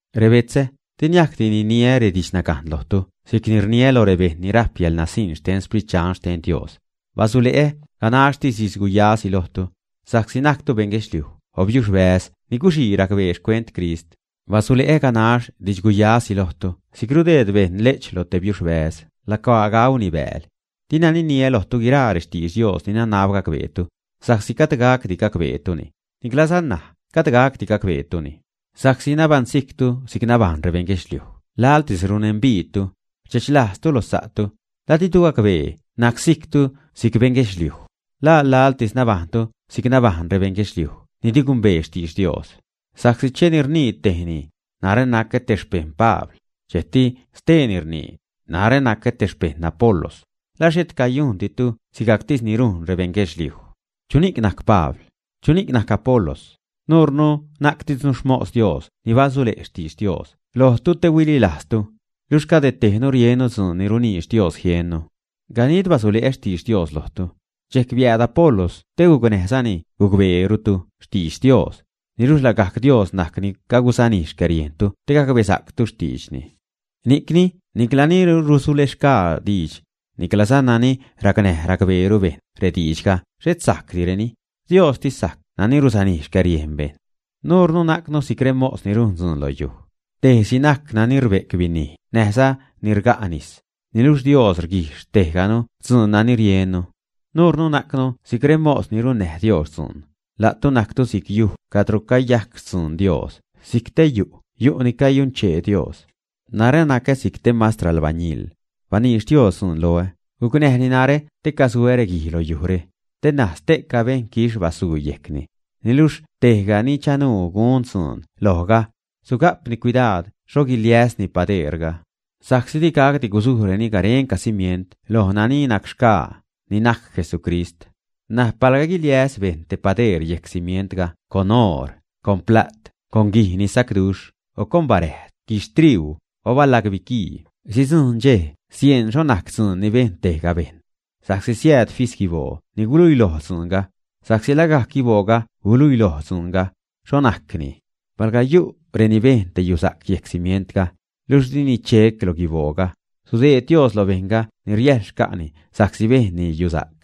Rebetzä, di niajcdi niniä redidxnagajn lojtu si'c ni rniä loj rebejṉ ni rajp yäḻnasiṉ xten Sprit Dxan xten Dios, basule'ä ganaxtis didx guyasi lojtu, sa'csi najctu beṉ guedxliuj o biuxbäz ni guxii racbeeni xcuent Crist. Basule'ä ganax didxguyasi lojtu si'c rudeed bejṉ le'ch lo te biuxbäz lacuaa gauni bääl. Dina niniä lojtu guiraa rextidx Dios ni nanab gacbeetu, sa'csi gajd gacdi gacbeetuni, niclaza ṉaj gajd gacdi gacbeetuni, sa'csi nabaṉsijctu si'c nabajṉ rebeṉ guedxliuj laḻtis runembiidtu, rdxechlajztu lo sa'tu, ¿la ditu gacbee nacsijctu si'c beṉ guedxliuj, ä? ¿La laḻtis nabajṉtu si'c nabajṉ rebeṉ guedxliuj ni di gumbee xtidx Dios, ä? Sa'csi cheni rnii tejni: “Narä nacä te xpejṉ Pabl”, dxejcti steeni rnii: “Narä nacä te xpejṉ Apolos”, ¿la xhet cayujnditu sigajctis ni rujn rebejṉ guedxliuj, ä? ¿Chuni'c najc Pabl? ¿Chuni'c najc Apolos? Nuurnu najctisnu xmos Dios ni basule' xtidx Dios lojtu te huililajztu, luxh cade tejnu riennu dzuun ni runiidx Dios jiennu. Ganid basule'ä xtidx Dios lojtu, dxejc biääd Apolos te gucnäjzani gucbeerutu xtidx Dios, niluxh lagajc Dios najc ni cagusanij xcäriejntu te gacbesa'ctu xtiidxni. Ni'cni nicla ni rusulexgaa diidx, niclaza nani racnäj racbeeru bejṉ rediidxga xhet sajcdireni; Diostis sajc nani rusanij xcäriejn rebejṉ. Nuurnu najcnu si'c rexmos ni rujn dzuun lo yuj. Tejsi najc nani rbe'c binij näjza nani rga' nis, niluxh Dios rguijx tejganu dzuun nani riennu. Nuurnu najcnu si'c remos ni runnäj Dios dzuun. La'tu najctu si'c yuj cadro cayajc xtzun Dios, si'c te yu' ni cayunchee Dios. Narä nacä si'c te mastr albañil. Baniidx Dios dzuun loä, gucnäjni narä te casuä reguij lo yujre, te ṉaj ste'ca bejṉ quixh basuu yejcni. Niluxh tejga ni chanuu gun dzuun lojga, suga'pni cuidaad xho guiliäsni padeerga. Sa'csi di gacdi gusujreni garenca cimient loj nani najc-xgaa, ni najc Jesucrist. N̲aj palga guiliäs bejṉ te padeer yejc cimientga con oor, con pla't, con guij ni sacduxh, o con baräjd, guixhtriuu, o balag biquii, sidzujṉ dxej sieṉ xho najc dzuun ni bejn tejga bejṉ. Sa'csi siääd fis guiboo ni guluiloj dzuunga, sa'csi lagajc guibooga guluiloj dzuunga, xho najcni. Palga yu' reni bejn te yusa'c yejc cimientga, luxh dini chec lo guibooga, sudeed Dios lo bejṉga ni riäjl xca'ni sa'csi bejnni yusa'c.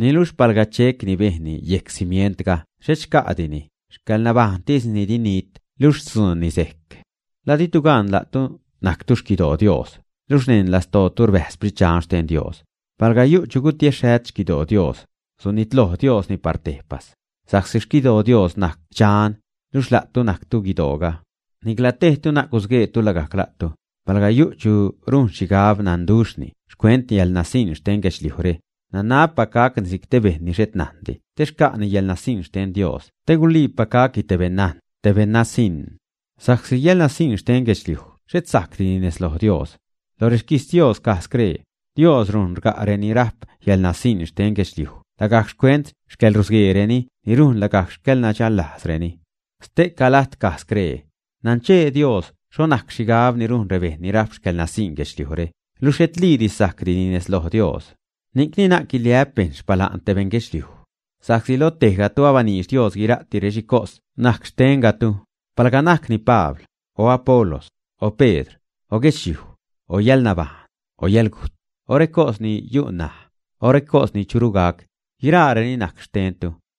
Niluxh palga chec ni bejnni yejc cimientga xhet xca' dini, xcäḻnabajṉtisni di nit, luxh xtzuunni sejc. ¿La ditu gan la'tu najctu xquidoo Dios, luxh neṉ lastootu rbäjz Sprit Dxan xten Dios, ä? Palga yu' chu gutiexhät xquidoo Dios, sunitloj Diosni par tejpas, sa'csi xquidoo Dios najc dxan, luxh la'tu najctu guidooga. Nicla tejtu na'c gusgueetu lagajc la'tu. Palga yu' chu rujn xhigab nanduxhni xcuent yäḻnasiṉ xten guedxliujre, nanabpac gacni si'c te bejṉ ni xhet najndi te xca'ni yäḻnasiṉ xten Dios te guliipac gacni te beṉnajn, te beṉ nasiṉ. Sa'csi yäḻnasiṉ xten guedxliuj xhet sajcdi nez loj Dios. Lo rexquijtz Dios caj scree: “Dios rujn rga' reni rajp yäḻnasiṉ xten guedxliuj lagajc xcuent xcäḻrusgueereni ni rujn lagajc xcäḻnadxäḻlajzreni.” Ste'ca lajt caj scree: “Nanchee Dios xho najc xhigab ni rujn rebejṉ ni rajp xcäḻnasiṉ guedxliujre, luxh xhetliidi sajcni nez loj Dios.” Ni'cni na'c guiliä'p bejṉ xpala'n te bejṉ guedxliuj. Sa'csi loj tejgatu abaniidx Dios guira'ti rexhicos najc xtengatu, palga najcni Pabl, o Apolos, o Pedr, o guedxliuj, o yäḻnabajṉ, o yäḻgujt, o recos ni yu' ṉaj, o recos ni churu gac, guiraareni najc xtentu.